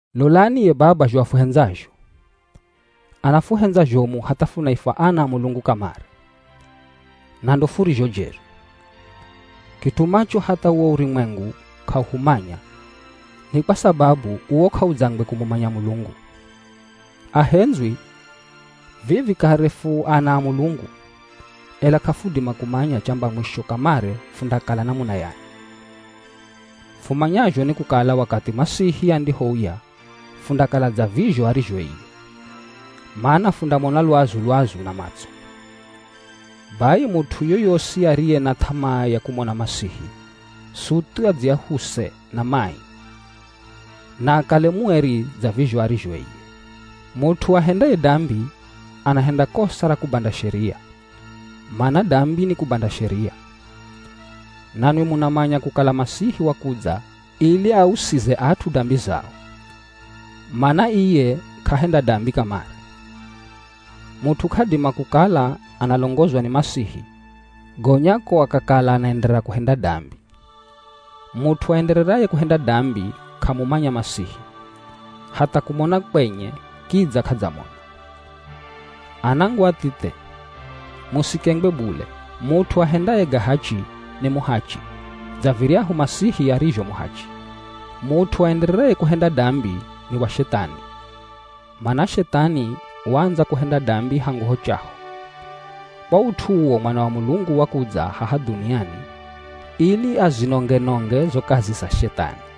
Lolani ye Baba zho afuhendzazho! Anafuhendza zhomu hatha funaifwa ana a Mulungu kamare. Na ndo furizho jeri. Kitumacho hatha uwo urumwengu k'auhumanya, ni kwa sababu uwo k'audzangwe kumumanya Mulungu. Ahendzwi, vivi kare fu ana a Mulungu, ela k'afudima kumanya chamba mwisho kamare fundakala namuna yani. Fumanyazho ni kukala wakathi Masihi andihouya, fundakala dza vizho arizho iye, mana fundamona lwazu-lwazu na matso. Bai mut'u yoyosi ariye na th'amaa ya kumona Masihi, suthi adziahuse na mai na akale mueri dza vizho arizho iye. Mut'u ahendaye dambi anahenda kosa ra kubanda sheria, mana dambi ni kubanda sheria. Nanwi munamanya kukala Masihi wakudza ili aausize at'u dambi zao, mana iye k'ahenda dambi kamare. Mut'u k'adima kukala analongozwa ni Masihi, gonya ko akakala anaenderera kuhenda dambi. Mut'u aendereraye kuhenda dambi k'amumanya Masihi, hatha kumona kwenye kidza k'adzamona. Anangu athithe, musikengwe bule, mut'u ahendaye ga hachi, ni muhachi, dza viryahu Masihi arizho muhachi. Mut'u aendereraye kuhenda dambi ni wa Shethani, mana Shethani waandza kuhenda dambi hangu ho chaho. Kwa ut'u uwo Mwana wa Mulungu wakudza haha dhuniani ili azinonge-nonge zo kazi za Shethani.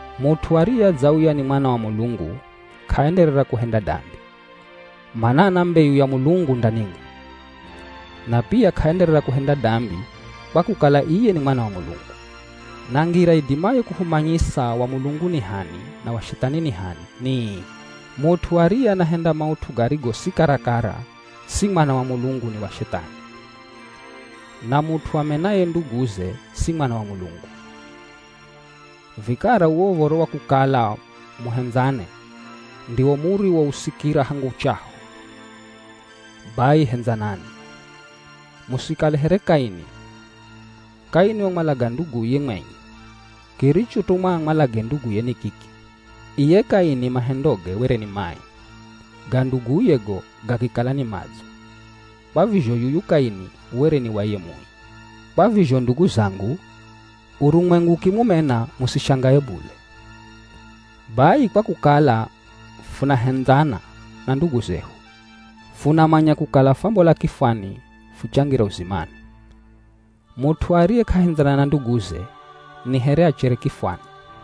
Mut'u ariye adzauya ni mwana wa Mulungu, k'aenderera kuhenda dambi, mana ana mbeyu ya Mulungu ndanimwe, na pia k'aenderera kuhenda dambi kwa kukala iye ni mwana wa Mulungu. Na ngira idimayo kuhumanyisa wa Mulungu ni h'ani na wa Shethani ni h'ani ni ii: Mut'u ariye anahenda maut'u garigo si karakara si mwana wa Mulungu ni wa Shethani. Na mut'u amenaye nduguze si mwana wa Mulungu. Vikara uwo uv̱oro wa kukala muhendzane, ndiwo muriwousikira hangu chaho. Bai hendzanani. Musikale here Kaini. Kaini wamwalaga nduguye mwenye. Kirichotuma amwalage nduguye ni kiki: Iye Kaini mahendoge were ni mai, ga nduguye go gakikala ni madzo. Kwa vizho yuyu Kaini were ni wa ye Mui. Kwa vizho ndugu zangu, urumwengu ukimumena, musishangae bule. Bai kwa kukala funahendzana na ndugu zehu, funamanya kukala fwambola kifwani fuchangira uzimani. Mut'u ariye k'ahendzana na nduguze, ni here achere kifwani.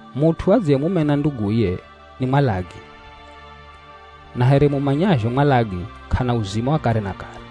Mut'u adziyemumena nduguye ni mwalagi. Na here mumanyazho mwalagi k'ana uzima wa kare na kare.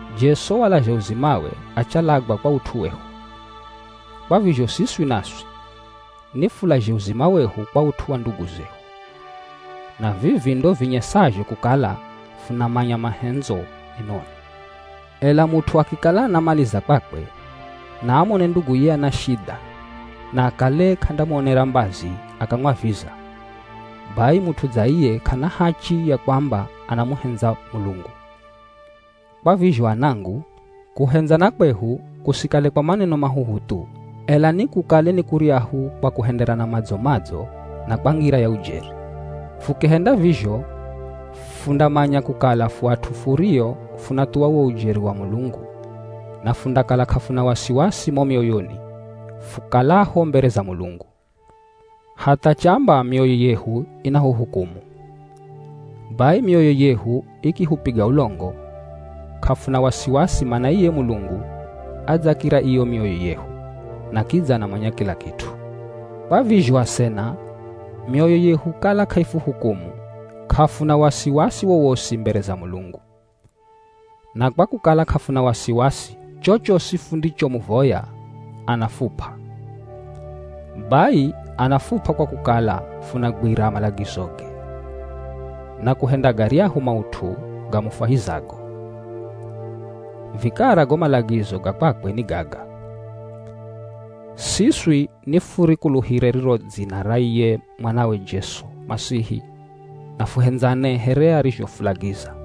Jesu walazha uzimawe achalagwa kwa ut'u wehu. Kwa vizho siswi naswi nifulazhe uzima wehu kwa ut'u wa ndugu zehu. Na vivi ndo vinyesazho kukala funamanya mahendzo ni noni. Ela mut'u akikala ana mali za kwakwe, na amone nduguye ana shidha na akale k'andamuonera mbazi akamwaviza, bai mut'u dza iye k'ana hachi ya kuamba anamuhendza Mulungu. Kwa vizho anangu, kuhendzana kwehu kusikale kwa maneno mahuhu thu, ela ni kukale ni kuryahu kwa kuhenderana madzo-madzo na kwa ngira ya ujeri. Fukihenda vizho, fundamanya kukala fu at'u furio funathuwa uwo ujeri wa Mulungu na fundakala k'afuna wasiwasi mo mioyoni fukalaho mbere za Mulungu, hatha achamba mioyo yehu inahuhukumu. Bai mioyo yehu ikihupiga ulongo, k'afuna wasiwasi mana iye Mulungu adzakira iyo mioyo yehu, na kidza anamanya kila kit'u. Kwa vizho asena, mioyo yehu kala k'aifuhukumu, k'afuna wasiwasi wowosi mbere za Mulungu. Na kwa kukala k'afuna wasiwasi, chochosi fundichomuvoya anafup'a. Bai anafup'a kwa kukala funagwira malagizoge, na kuhenda garyahu maut'u gamufwahizago. Vikara go malagizo ga kwakwe ni gaga: Siswi nifurikuluhire riro dzina ra iye Mwanawe Jesu Masihi na fuhendzane here arizhofulagiza.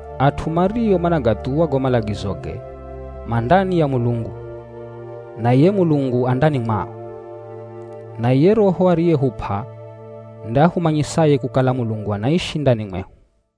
At'u mario managathuwa go malagizoge, ma ndani ya Mulungu, na iye Mulungu a ndani mwao. Na iye Roho ariyehup'a nde ahumanyisaye kukala Mulungu anaishi ndani mwehu.